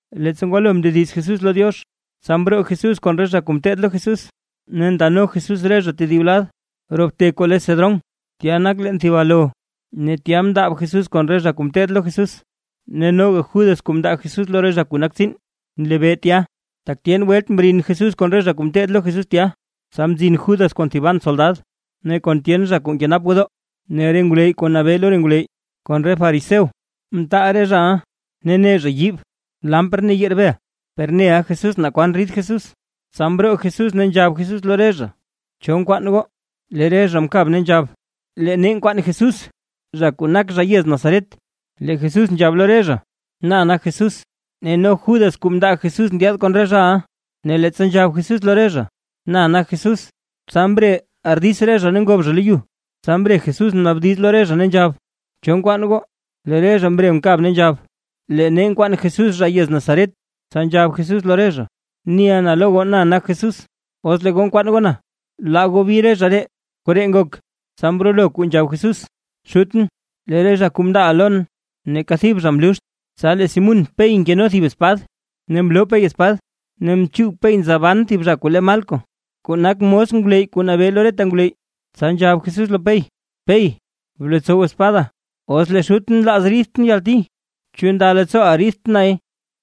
Leettsa ngwalo mndediz Jesús lo Diox, tsa mroo Jesús kon re zha kuu ngeteed lo Jesús, ne ndano Jesús re zha tedib lad roo bte kuu le Cedrón. Tya nak leen thib alo. Ne tya mndaab Jesús kon re zha kuu ngeteed lo Jesús. Noga Judas kuu mndaa Jesús lo re zha nak tsiin nlebee tya, tak tyen welt mrin Jesús kon re zha kuu ngeteed lo Jesús tya. Tsa mzin Judas kon thiban soldad ne kon tyen zha kuu nkenap gwodoo; ne re ngwleyy kuu nabee lo re ngwleyy kon re fariseo mtaal re zhaʼa, ne ne zha yiib, kandil ne yerbel. Per neʼa Jesús naa kwan rid Jesús, tsa mroo Jesús ne nzhab Jesús lo re zha: ―¿Cho nkwaan goo? Lee re zha mkab ne nzhab: ―Lee nee nkwaan Jesús zha kuu nak zha yez Nazaret. Lee Jesús nzhab lo re zha: ―Na nak Jesús. Ne no Judas kuu mndaa Jesús ndyaad kon re zhaʼa. Ne leettsa nzhab Jesús lo re zha, na nak Jesús, tsa mre ardits re zha ne ngob zha lo yu. Tsa mre Jesús mnaabdiz lo re zha ne nzhab: ―¿Cho nkwaan goo? Lee re zha mre mkab ne nzhab: ―Lee nee nkwaan Jesús zha yez Nazaret. Tsa nzhab Jesús lo re zha: ―Niʼa na lo goo, na nak Jesús. Os lee goo nkwaan goo na, laa goo bi re zha ree. Koree ngok, tsa mrolo kuu nzhab Jesús, Xutʼn lee re zha kuu mndaaʼa lon, neeka thib zha mluxt. Tsa lee Simún Pey nkeno thib espad, ne mloo Pey espad ne mchuug Pey nza ban thib zha kuu lee Malco kuu nak mos ngwleyy kuu nabee lo reta ngwleyy. Tsa nzhab Jesús lo Pey: ―Pey blotsow espada. Os lee Xutʼn nlaaz riidʼn yalti, ¿chu nda leettsooʼa riidt nay?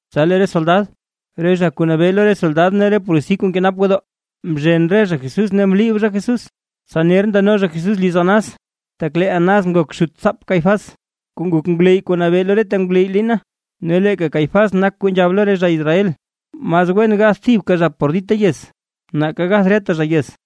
Tsa lee re soldad, re zha kuu nabee lo re soldad ne re polisi kuu nkenap gwodoo, mzhen re zha Jesús ne mliib zha Jesús. Tsa ner ndano zha Jesús liz Anás, tak lee Anás nak xutsaap Caifás kuu nak ngwleyy kuu nabee lo reta ngwleyy liina. Ne leeka Caifás nak kuu nzhab lo re zha Israel, mas wen gath thibka zha por dita yez, nake gath reta zha yez.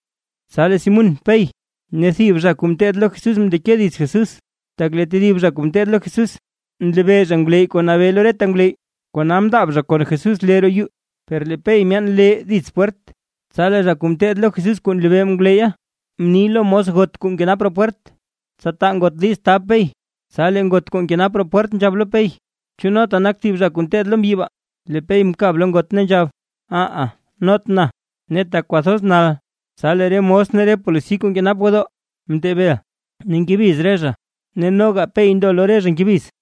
Tsa lee Simún Pey ne thib zha kuu ngeteed lo Jesús mndeke dits Jesús. Tak lee tedib zha kuu ngeteed lo Jesús nlebee zha ngwleyy kuu nabee lo reta ngwleyy, kona mndaab zha kon Jesús lee roo yuu. Per lee Pey myaan lee dits pwert, tsa lee zha kuu mteed lo Jesús kuu nlebee ngwleyya, mni lo mos got kuu nkenap roo pwert, tsa taa ngot diiz tab Pey. Tsa lee ngot kuu nkenap roo pwert nzhab lo Pey: ―¿Chu nota nak thib re zha kuu ngeteed lo mbyi baa? Lee Pey mkab lo ngot ne nzhab: ―Aha not na. Ne tak kwathoz nal, tsa lee re mos ne re polisi kuu nkenap gwodoo mtee bel, ne ngebiz re zha ne noga Pey ndo lo re zha ngebiz.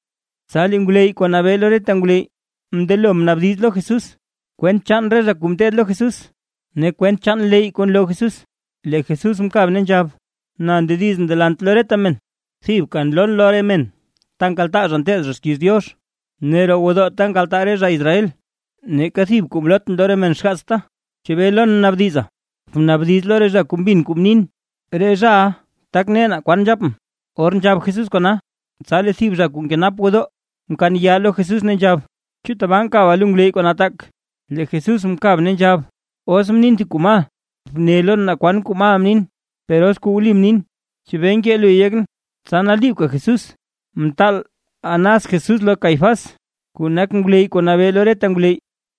Tsa lee ngwleyy kuu nabee lo reta ngwleyy mndelo mnaabdiz lo Jesús, kwent chaan re zha kuu mteed lo Jesús ne kwent leyy kuu nloo Jesús. Lee Jesús mkab ne nzhab: ―Na ndedizʼn delant lo reta men, thibka nloon lo re men ta nkaltaa zha nteed zha xkiiz Diox, ne roo gwodoo ta nkaltaa reta zha Israel, neeka thib kuu mlootʼn lo re men xgaatsta. ¿Chebee lon naabdiza? Bnaabdiz lo re zha kuu mbin kuu mnin. Re zhaʼa tak ne naa kwan nzhapʼn. Or nzhab Jesús kona, tsa lee thib zha kuu nkenap gwodoo mkaan yaa lo Jesús ne nzhab: ―¿Chu tabaa nkaba lo ngwleyy kuu nataak? Lee Jesús mkab ne nzhab: ―Os mnin thib kuu mal, bne lon naa kwan kuu mal mnin; per os kuu wli mnin, ¿chebee nkee luy yekʼn? Tsa naliibka Jesús mtaal Anás Jesús lo Caifás kuu nak ngwleyy kuu nabee lo reta ngwleyy.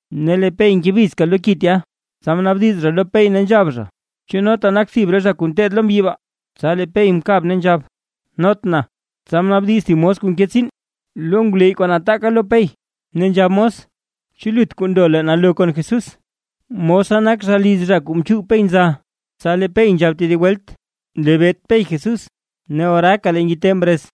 Ne lee Pey ngebizka lo ki tya, tsa mnaabdiz zha lo Pey ne nzhab zha: ―¿Chu nota nak thib re zha kuu ngeteed lo mbyi baa? Tsa lee Pey mkab ne nzhab: ―Not na. Tsa mnaabdiz thib mos kuu nke tsiin lo ngwleyy kuu nataaka lo Pey ne nzhab mos: ―¿Chu lut kuu ndo leen alo kon Jesús? Mosa nak zha liz zha kuu mchuug Pey nza. Tsa lee Pey nzhab tedib welt, nlebeet Pey Jesús, ne oraaka lee ngite mrez.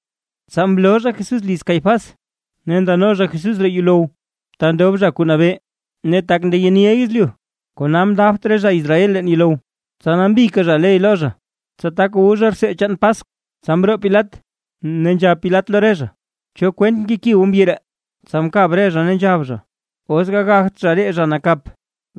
Tsa mloo zha Jesús liz Caifás, ne ndano zha Jesús roo yuulow, ta ndob zha kuu nabee ne tak ndeyeniʼa yezlyu, kona mndaabt re zha Israel leen yuulow, tsa nambika zha ley lo zha, tsa tak wu zha rtsee chaan Paskw. Tsa mroo Pilat, ne nzhab Pilat lo re zha: ―¿Cho kwent nkeki goo mbyi ree? Tsa mkab re zha, ne nzhab zha: ―Os gagagt zha ree zha nakap,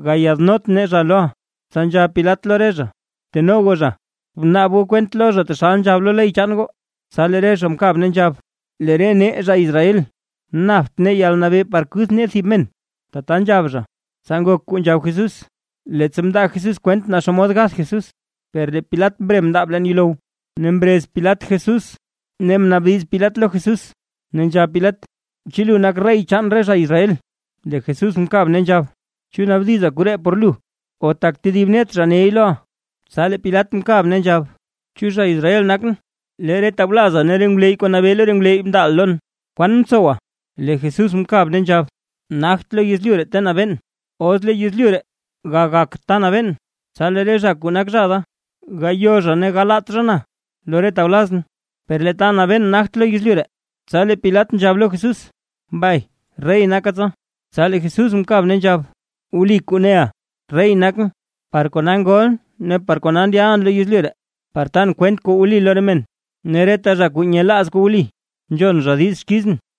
gayaadnot nee zha loʼa. Tsa nzhab Pilat lo re zha: ―Bteno goo zha, bnaab goo kwent lo zha taxal nzhab lo ley chaan goo. Tsa lee re zha mkab ne nzhab: ―Lee re nee zha Israel, napt nee yalnabee par kuth nee thib men. Tata nzhab zha, tsa ngok kuu nzhab Jesús, leettsa mndaa Jesús kwent naa xomod gath Jesús. Per lee Pilat mre mndaab leen yuulow, ne mrez Pilat Jesús ne mnaabdiz Pilat lo Jesús ne nzhab Pilat: ―¿Chu lu nak rey chaan re zha Israel? Lee Jesús mkab ne nzhab: ―¿Chu naabdiza koree por lu, o tak tedib net zha ney loʼa? Tsa lee Pilat mkab ne nzhab: ―¿Chu zha Israel nakʼn? Lee re tawlaza ne re ngwleyy kuu nabee lo re ngwleyy mndaaʼa lon. ¿Kwan mtsowa? Lee Jesús mkab ne nzhab: ―Nagt lo yezlyu ree ta nabeen, os lo yezlyu ree gagak ta nabeen, tsa lee re zha kuu nak zha da, gayo zha ne galaat zha na lo re tawlazʼn. Per lee ta nabeen nagte lo yezlyu ree. Tsa lee Pilat nzhab lo Jesús: ―¿Mbay rey naka tsa? Tsa lee Jesús mkab ne nzhab: ―Wli kuu neʼa, rey nakʼn. Par kona ngolʼn ne par kona ndyalʼn lo yezlyu ree; par tan kwent kuu wli lo re men. Ne reta zha kuu nyelaaz kuu wli nzhon zha diiz xkizʼn.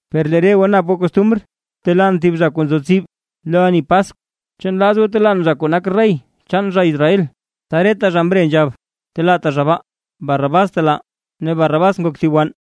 Per lee re goo nap goo costumr, telaan thib zha kuu nzo tsib lo ani Paskw. ¿Chu nlaaz goo telaan zha kuu nak rey chaan re zha Israel? Tsa reta zha mre nzhab: ―¡Telaata zha baa! ¡Barrabás btelaa! Ne Barrabás nak thib wann.